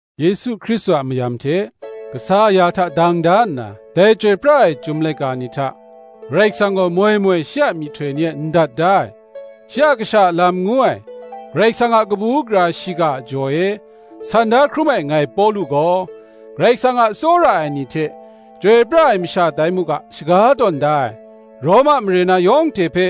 Yesu Hkristu a mayam hte, kasa aya hta dang da nna, dai chyoi pra ai Chyum laika ni hta Karai Kasang gaw moi moi shi a myihtoi ni e ndat da ai, shi a Kasha a lam ngu ai, Karai Kasang a kabu gara shiga a jaw e san da hkrum ai, ngai Pawlu gaw, Karai Kasang a tsawra ai ni hte, chyoi pra ai masha tai mu ga shaga tawn da ai, Roma mare na yawng hte hpe,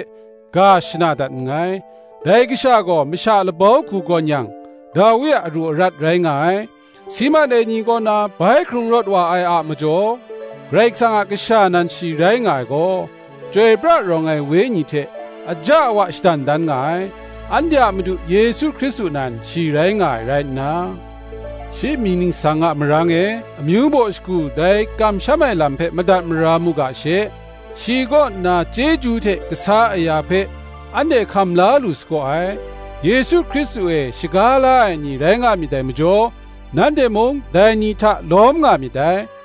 ga shana dat nngai. Dai kasha gaw masha labau hku gawn yang, Dawi a aru arat rai nga ai; si mat ai ni kaw na bai hkrung rawt wa ai a majaw, Karai Kasang a Kasha nan shi rai nga ai gaw, chyoi pra rawng ai Wenyi hte aja awa shadan dan nga ai; anhte a Madu Yesu Hkristu nan shi rai nga ai rai nna, shi mying ningsang a marang e, amyu baw shagu dai kamsham ai lam hpe madat mara mu ga she, shi kaw nna chyeju hte kasa aya hpe anhte hkam la lu sagaw ai: Yesu Hkristu e shaga la ai ni rai nga myit dai majaw, nanhte mung dai ni hta lawm nga myit dai.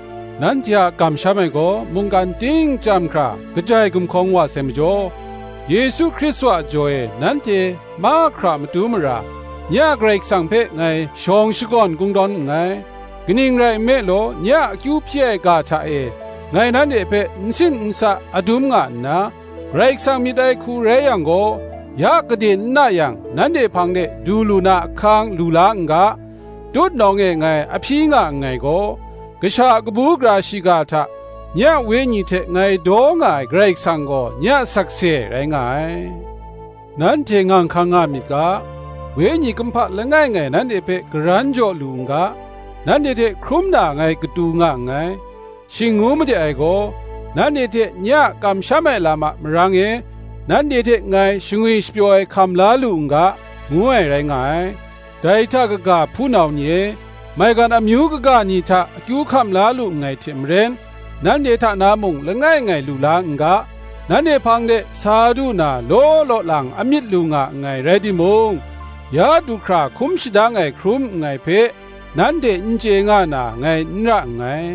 Nanhte a kamsham ai gaw mungkan ting chyam hkra kajai gumhkawng wa sai majaw, Yesu Hkristu a jaw e, nanhte mahkra a matu mara, nye a Karai Kasang hpe, ngai shawng shakawn kungdawn nngai. Kaning rai nme law, nye a akyu hpyi ai ga hta e ngai nanhte hpe n sim n sa adum nga nna, Karai Kasang myit ai hku rai yang gaw, ya gade n na yang nanhte hpang de du lu na ahkang lu la n ga, tutnawng e ngai a hpyi nga nngai gaw, Kasha a kabu gara shiga hta, nye a wenyi hte ngai daw nga ai Karai Kasang gaw, nye a sakse rai nga ai. Nanhte ngang hkang nga myit ga, wenyi kumhpa langai ngai nanhte hpe karan jaw lu n ga, nanhte hte hkrum na ngai katu nga nngai: shing ngu made ai gaw, nanhte hte nye a kamsham ai lam a marang e, nanhte hte ngai, shangwi shapyaw ai hkam la lu n ga, ngu ai rai nga ai. Dai hta kaga, hpunau ni e, maigan amyu kaga ni hta akyu hkam la lu nngai hte maren, nanhte hta na mung langai ngai lu la n ga, nanhte hpang de sa du na law law lang a myit lu nga nngai rai timung, ya du hkra hkum shadang ai hkrum nngai hpe, nanhte n chye nga na ngai n ra nngai.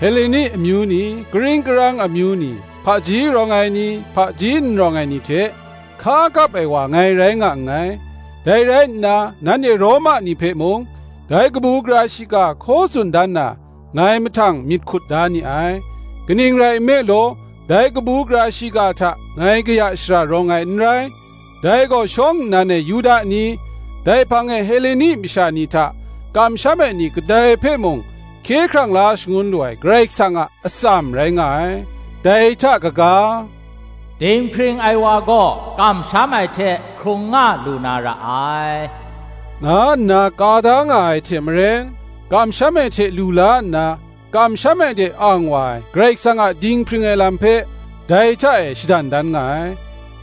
Heleni amyu ni, karing karang amyu ni, hpaji rawng ai ni, hpaji n rawng ai ni hte, hka kap ai wa ngai rai nga nngai, Dai rai nna, nanhte Roma ni hpe mung dai kabu gara shiga hkaw tsun dan na, ngai mahtang myit hkut da ni ai. Kaning rai nme law, dai kabu gara shiga hta ngai kaya shara rawng ai n rai: dai gaw shawng nnan e Yuda ni, dai hpang e Heleni masha ni hta kamsham ai ni kadai hpe mung hkye hkrang la shangun lu ai Karai Kasang a atsam rai nga ai. Dai hta kaga, Dinghpring ai wa gaw kamsham ai hte hkrung nga lu na ra ai, nga nna ka da nga ai hte maren, kamsham ai hte lu la nna kamsham ai de ang wa ai, Karai Kasang a dinghpring ai lam hpe, dai hta e shadan dan nga ai.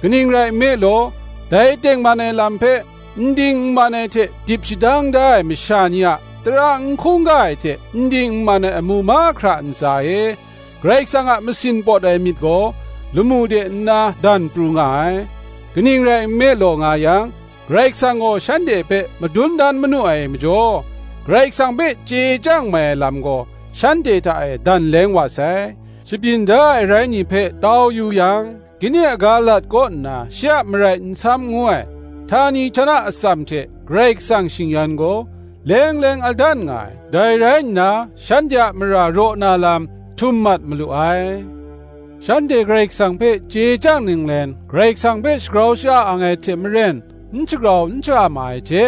Kaning rai nme law, dai tengman ai lam hpe n ding n man ai hte dip shadang da ai masha ni a tara n hkungga ai hte n ding n man ai amu mahkra a ntsa e, Karai Kasang a masin pawt ai myit gaw, lamu de nna dan pru nga ai: kaning rai law nga yang, Karai Kasang gaw shanhte hpe madun dan manu ai majaw, Karai Kasang hpe chye chyang mai ai lam gaw, shanhte hta e dan leng wa sai. Shabyin da ai arai ni hpe tau yu yang, ginding aga lat kaw nna shi a marai nsam ngu ai, htani htana atsam hte Karai Kasang shing-yan gaw, leng leng a dan nga ai; dai rai nna, shanhte a mara raw na lam htum mat malu ai. Shanhte Karai Kasang hpe chye chyang ninglen, Karai Kasang hpe shagrau sha-a ang ai hte maren, n shagrau n sha-a ma ai hte,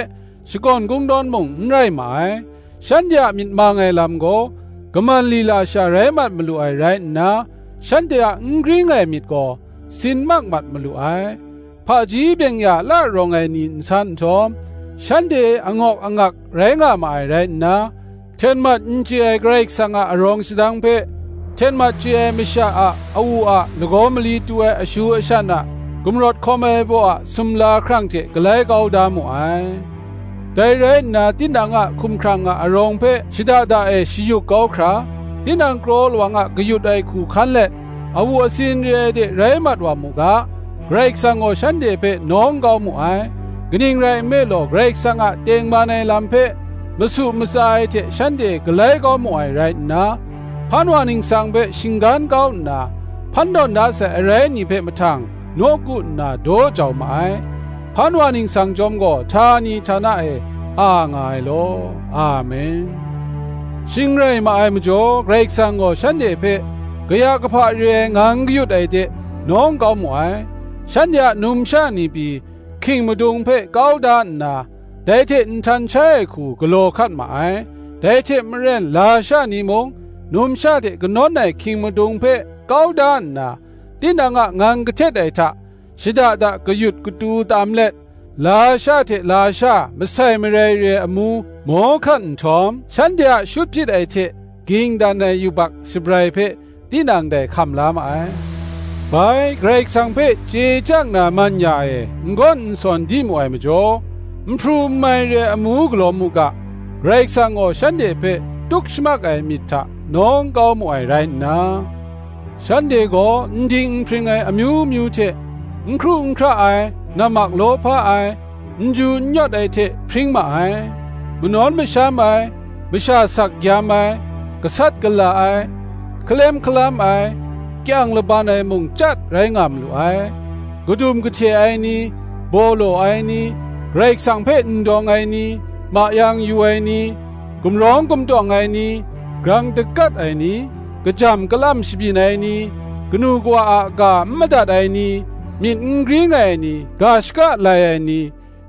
shakawn kungdawn mung n rai ma ai; shanhte a myit mang ai lam gaw, kaman lila sha rai mat malu ai rai nna, shanhte a n gring ai myit gaw, sin mak mat malu ai. Hpaji byeng-ya la rawng ai ni nsan nhtawm, shanhte angawk angak rai nga ma ai rai nna, hten mat n chye ai Karai Kasang a arawng sadang hpe, hten mat chye ai masha a, awu a, lagaw mali tu ai ashu ashan a, gumrawt hkawm ai baw a sumla hkrang hte galai kau da mu ai. Dai rai nna, tinang a hkumhkrang a arawng hpe shada da e shayuk kau hkra, tinang kraw lawang a kayut ai hku hkan let, awu asin re ai de rai mat wa mu ga, Karai Kasang gaw shanhte hpe nawng kau mu ai; kaning rai nme law, Karai Kasang a tengman ai lam hpe masu matsa ai hte shanhte galai kau mu ai rai nna, Hpan wa Ningsang hpe shinggan kau nna, hpan tawn da sai arai ni hpe mahtang nawku nna daw jau ma ai: Hpan wa Ningsang chyawm gaw htani htana e a nga ai law. Amen. Shing rai ma ai majaw, Karai Kasang gaw shanhte hpe kaya kahpa re ai ngang kayut ai de nawng kau mu ai: shanhte a numsha ni pyi, hking madung hpe kau da nna, dai hte nhtan shai ai hku galaw hkat ma ai; dai hte maren lasha ni mung numsha hte kanawn ai hking madung hpe kau da nna, tinang a ngang kahtet ai hta shada da kayut katu tam let, lasha hte lasha masai marai re ai amu maw hkat nhtawm, shanhte a shut hpyit ai hte ging dan ai yubak shabrai hpe, tinang dai hkam la ma ai. Bai, Karai Kasang hpe chye chyang na man ya e n gawn n sawn di mu ai majaw, n hpru n mai re ai amu galaw mu ga, Karai Kasang gaw shanhte hpe tuk shamak ai myit hta nawng kau mu ai rai nna, shanhte gaw n ding n hpring ai amyu myu hte, n hkru n hkra ai, nammak lawhpa ai, n ju n yawt ai hte hpring ma ai; manawn masham ai, masha sak gyam ai, gasat gala ai, hkalem hkalam ai, kyang laban ai mung chyat rai nga malu ai: kadum kahte ai ni, baw law ai ni, Karai Kasang hpe n dawng ai ni, mayang yu ai ni, gumrawng gumtawng ai ni, grang dakat ai ni, kajam galam shabyin ai ni, kanu kawa a ga n madat ai ni, myit n gring ai ni, ga shaka lai ai ni,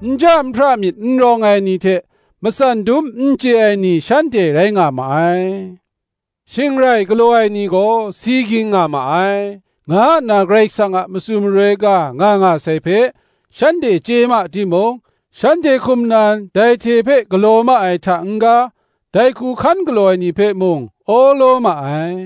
nja nhpra myit n rawng ai ni hte matsan dum n chye ai ni, shanhte rai nga ma ai: shing rai galaw ai ni gaw si ging nga ma ai, nga nna Karai Kasang a matsun maroi ga nga nga sai hpe, shanhte chye ma timung, shanhte hkum nan dai hte hpe galaw ma ai hta n-ga, dai hku hkan galaw ai ni hpe mung, awlaw ma ai.